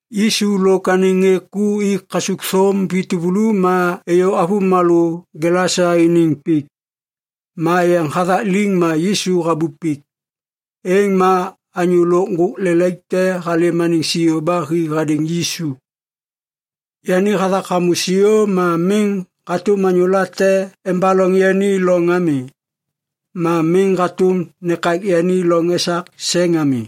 Yisu lôk anêŋ ŋê ku i kasukthôm vi tuvulu ma êyô avômalô Gelasa iniŋ pik. Ma yeŋ hathak liŋ ma Yisu habup pik. Êŋ ma anyô lôk ŋgôk lelaik te halêm anêŋ siô ba hi hadêŋ Yisu. Yani hathak hamô siô ma miŋ hatôm anyô late embaloŋ yani loŋ ami. Ma miŋ hatôm nekak yani loŋ esak seŋ ami.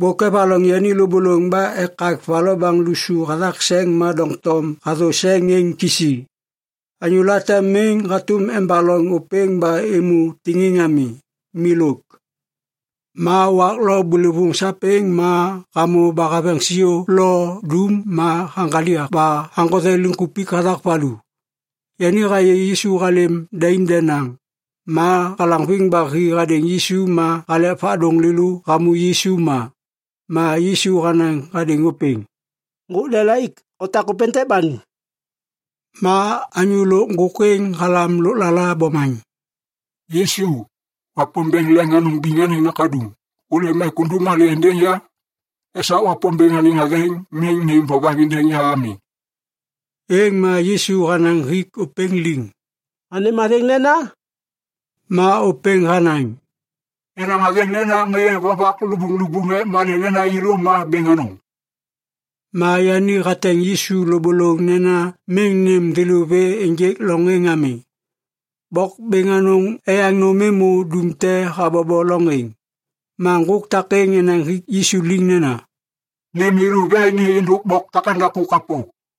Bôk evaloŋ yani lôbôlôŋ ba ekak va lobaŋ lusu hathak seŋ ma doŋtom hathô seŋ êŋ kisi. Anyô late miŋ hatôm embaloŋ ôpêŋ ba êmô tiŋiŋ ami, milôk. Ma wak lo bôlôvôŋ sapêŋ ma hamô ba haveŋ siô lo dum ma haŋgaliak ba haŋgothe liŋkupik hathak valu. Yani hayê Yisu halêm daim denaŋ, ma halaŋviŋ ba hi hadêŋ Yisu ma halek vadôŋ lêlô hamô Yisu ma. Ma Yisu hanaŋ hadêŋ ôpêŋ, “Ŋgôk lelaik, otak ôpêntêk ba nu.” Ma anyô lôk ŋgôk êŋ halam lôklala bomaŋ, “Yisu, Wapômbêŋ Leŋ Anôŋ Biŋ anêŋ Nakaduŋ, hôlêm ek undum malê êndêŋ ya? Esak Wapômbêŋ anêŋ athêŋ miŋ nêm vovaŋ êndêŋ ya ami!” Êŋ ma Yisu hanaŋ hik ôpêŋ liŋ, “Anêm athêŋ nena?” Ma ôpêŋ hanaŋ, “Yenaŋ athêŋ nena Ŋê Vovak Lubuŋlubuŋ, ek malê nena yêlô ma bêŋ anôŋ.” Ma yani hateŋ Yisu lôbôlôŋ nena miŋ nêm thêlô vê ênjêk loŋ êŋ ami. Bok bêŋ anôŋ eyaŋ nôm êmô dum te habobo loŋ êŋ. Ma ŋgôk takêŋ enaŋ hik Yisu liŋ nena, “Nêm yêlô vê ni êndôk bok takêŋdaku kapô.”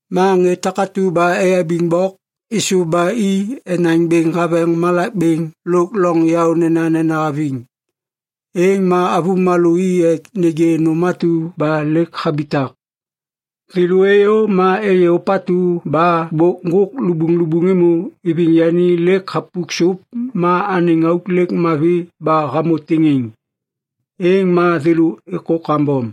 Ma ŋê takatu ba eyabiŋ bok êsôv ba i enaŋ bêŋ haveŋ malak bêŋ lôk loŋ yaô nenanena haviŋ. Êŋ ma avômalô i ek nêgê nôm atu ba lêk habitak. Thêlô êyô ma êyê ôpatu ba bôk ŋgôk lubuŋlubuŋ êmô iviŋ yani lêk hapuk sôp ma anêŋ auk mavi ba hamô tiŋiŋ. Êŋ ma thêlô êkô kambom.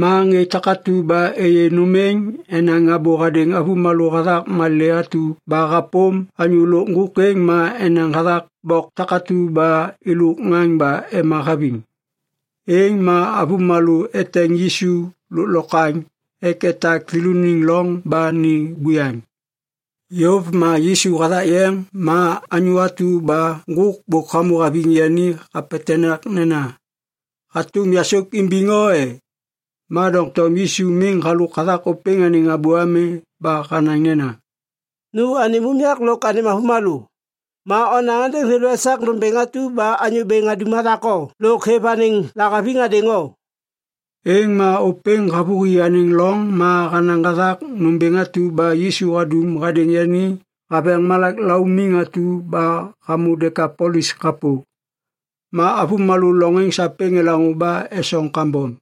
Ma ŋê takatu ba êyê nôm êŋ enaŋ abô hadêŋ avômalô hathak malê atu hapôm anyô lôk ŋgôk êŋ ma enaŋ hathak bok takatu ba elok ŋaŋ ba ema haviŋ. Êŋ ma avômalô eteŋ Yisu lôklokwaŋ ek etak thêlôniŋ loŋ ba ni buyaŋ. Yôv ma Yisu hathak yeŋ, ma anyô atu ba ŋgôk bôk hamô haviŋ yani hapetenak nena, “Hatôm yasôk imbiŋ o e?” Ma doŋtom Yisu miŋ halôk hathak ôpêŋ anêŋ abô ami ba hanaŋ nena, “Nu anêm unyak lôk anêm avômalô. Ma onaŋ êndêŋ thêlô esak nômbêŋ atu ba Anyô Bêŋ hadum hathak o lôk hêv anêŋ lahaviŋ hadêŋ o.” Êŋ ma ôpêŋ havôhi anêŋ loŋ ma hanaŋ hathak nômbêŋ atu ba Yisu hadum hadêŋ yani haveŋ malak laumiŋ atu ba hamô Dekapolis kapô. Ma avômalô loŋ êŋ sapêŋ elaŋô ba esoŋ kambom.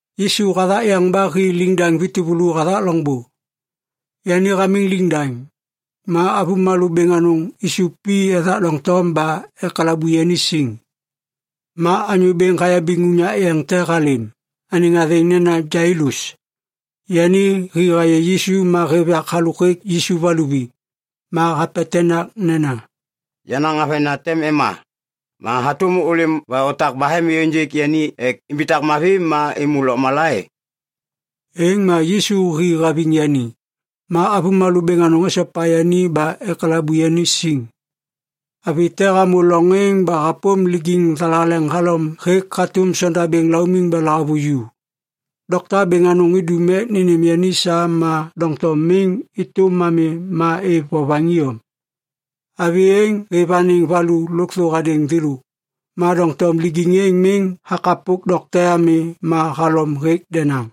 Yisu hathak yeŋ ba hi liŋdaŋ vi tuvulu hathak loŋbô. Yani hamiŋ liŋdaŋ, ma avômalô bêŋ anôŋ isup i ethak doŋtom ba ekalabu yani siŋ. Ma anyô bêŋ hayabiŋ unyak yeŋ te halêm, anêŋ athêŋ nena Jailus. Yani hi hayê Yisu ma hêv yak halôk Yisu va luvi. Ma hapetenak nena, “Yenaŋ avena tem ema. Ma hatôm ôlêm ba otak bahem êyôŋgêk yani ek imbitak mavi ba êmô lôkmala e?” Êŋ ma Yisu hi haviŋ yani. Ma avômalô bêŋ anôŋ esopa yani ba ekalabu yani siŋ. Avi te hamô loŋ êŋ ba hapôm lijiŋ thalaleŋ halom hatôm sondabêŋ laumiŋ ba lahavuju. Dokta bêŋ anôŋ idum ek nênêm yani sa ma doŋtom miŋ êtôm ami ma êv vovaŋ iyom. Avi êŋ hêv anêŋ valu lôkthô hadêŋ thêlô, ma doŋtom lijiŋ êŋ miŋ hakapok dokte ami ma halom hêk denaŋ.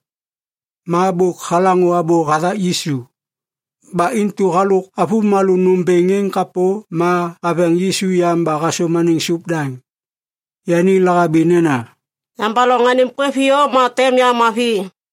Ma bôk halaŋô abô hathak Yisu, ba intu halôk avômalô nômbêŋ êŋ kapô ma haveŋ Yisu yam ba hasôm anêŋ sôp daŋ. Yani lahabi nena, “Yambaloŋ anêŋ kwêv iyom ma tem ya mavi.”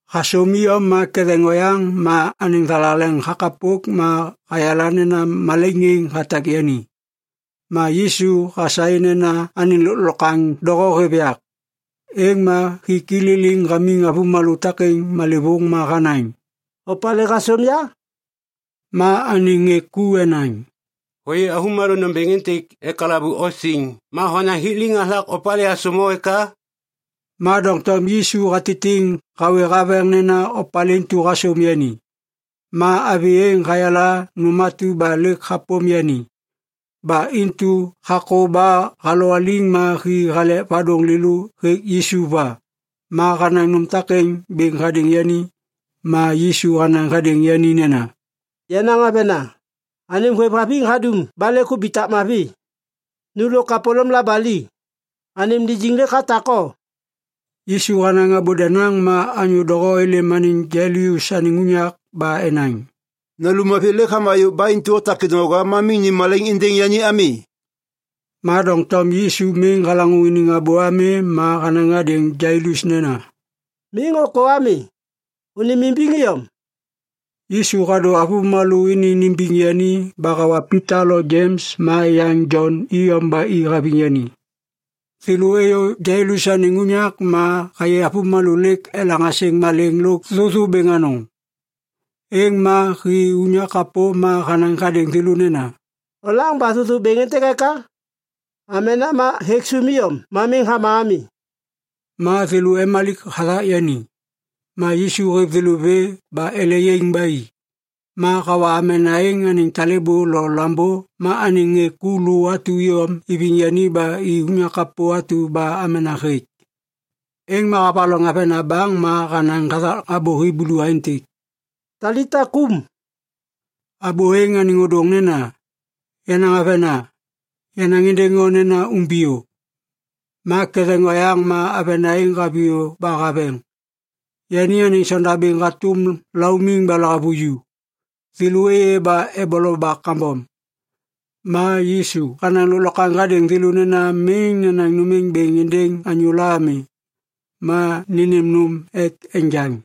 Hasôm iyom ma ketheŋ oyaŋ ma anêŋ thalaleŋ hakapok ma hayala nena malaiŋ êŋ hatak yani. Ma Yisu hasaê nena anêŋ lôklokwaŋ doho hêv yak. Êŋ ma hik i liliŋ hamiŋ avômalô takêŋ malêvôŋ ma hanaŋ, “Opalê hasôm ya?” Ma anêŋ ŋê ku enaŋ, “Hôyê avômalô nômbêŋ êntêk ekalabu o siŋ ma honaŋ hik liŋ hathak opalê hasôm o eka?” Ma doŋtom Yisu hatitiŋ hawê haveŋ nena opalê intu hasôm yani. Ma avi êŋ hayala nôm atu ba lêk hapôm yani, ba intu hakô ba halowaliŋ ma hi halek vadôŋ lêlô hêk Yisu va. Ma hanaŋ nôm takêŋ bêŋ hadêŋ yani. Ma Yisu hanaŋ hadêŋ yani nena, “Yenaŋ avena, anêm hôêvhaviŋ hadum ba lêk hubitak mavi. Nu lôk kapôlôm labali. Anêm lijiŋ lêk hatak o.” Yisu hanaŋ abô denaŋ ma anyô doho êlêm anêŋ Jailus anêŋ unyak ba enaŋ, “Nalum avi lêk hama yôv ba intu otak kêdôŋwaga ma miŋ nêm malaiŋ êndêŋ yani ami.” Ma doŋtom Yisu miŋ halaŋô iniŋ abô ami ma hanaŋ hadêŋ Jailus nena, “Miŋ ôkô ami, ônêmimbiŋ iyom.” Yisu hadô avômalô ini nimbiŋ yani ba hawa Pita lo Jems ma yaŋ Jon iyom ba i haviŋ yani. Thêlô êyô Jailus anêŋ unyak ma hayê avômalô lêk elaŋ asêŋ malêŋ lôk thôthô bêŋ anôŋ. Êŋ ma hi unyak kapô ma hanaŋ hadêŋ thêlô nena, “Olaŋ ba thôthô bêŋ êntêk eka? Amena ma hêk sôm iyom ma miŋ hama ami.” Ma thêlô emalik hathak yani. Ma Yisu hêv thêlô vê ba ele yaiŋ ba i, ma hawa amena êŋ anêŋ talêbô lo lambô ma anêŋ ŋê ku lô atu iyom iviŋ yani ba i unyak kapô atu ba amena hêk. Êŋ ma havaloŋ avena baŋ ma hanaŋ hathak abô Hiblu aêntêk, “Talita kum!” (Abô êŋ anêŋ ôdôŋ nena, “Yenaŋ avena, yanaŋ êndêŋ o nena umbiyô.”) Ma ketheŋ oyaŋ ma avena êŋ haviyô ba haveŋ. Yani anêŋ sondabêŋ hatôm laumiŋ ba lahavuju. Thêlô êyê ba eboloba kambom. Ma Yisu hanaŋ lôklokwaŋ hadêŋ thêlô nena miŋ nenaŋ nôm êŋ bêŋ êndêŋ anyôla ami. Ma nênêm nôm ek enjaŋ.